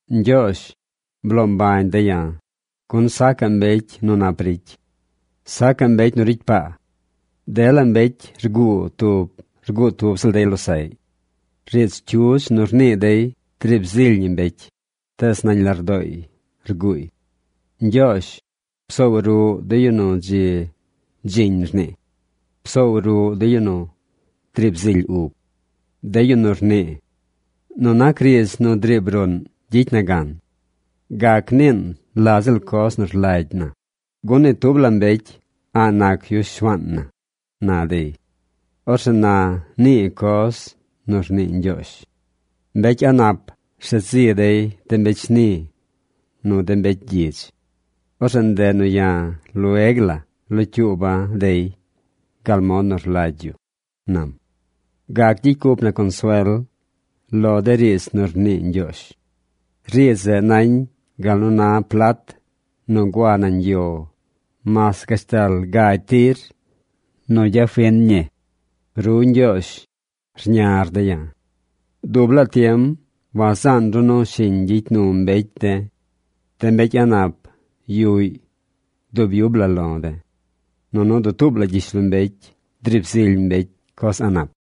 Ñgyoozh, bloo mbañ de̱ ya̱, gun sacaꞌ mbecy nu nap ricy. Sacaꞌ mbecy nu ricy paa. Dela mbecy rguu tub rguu tub ziꞌl dey losaꞌy. Riidz cyudz nu rnii dey driib zily ñi mbecy, tees nañ lardooy rguuy. Ñgyoozh, psoow ruꞌ de yu nu dzi dziñ rnii. Psoow ruꞌ de yu driib zily ub, de yu nu rnii: “Nu nac riidz nu driib ruꞌn gyicy na gan. Gac niin la ziꞌl coz nu rlagy na, gun ni tub la mbecy a̱ꞌ nac yu shuaan na”, na dey. Orzeꞌ na nii coz nu rnii Ñgyoozh: “Mbecy a̱ꞌ nap rshet zi dey de mbecy shni nu de mbecy gyidz. Orzeꞌ ndeꞌ nu ya̱ lueg la locyuuba̱ dey gal mod nu rlagy yu”, nam. Gac gyicy cup na consuel lo de riidz nu rnii Ñgyoozh. Riidz zeꞌ nañ gal nu na plat nu gua nañ yo mas gashtal gagy tir nu gyafin ñi. Ru, Ñgyoozh, rñar de̱ ya̱. ¡Dub laa tiem wazaan ru nu shiñ gyicy nu mbecy de̱! De mbecy a̱ꞌ nap yuꞌy dub yub la lo de̱. Nunu dutuub la gyishlombecy driib zily mbecy coz a̱ꞌ nap.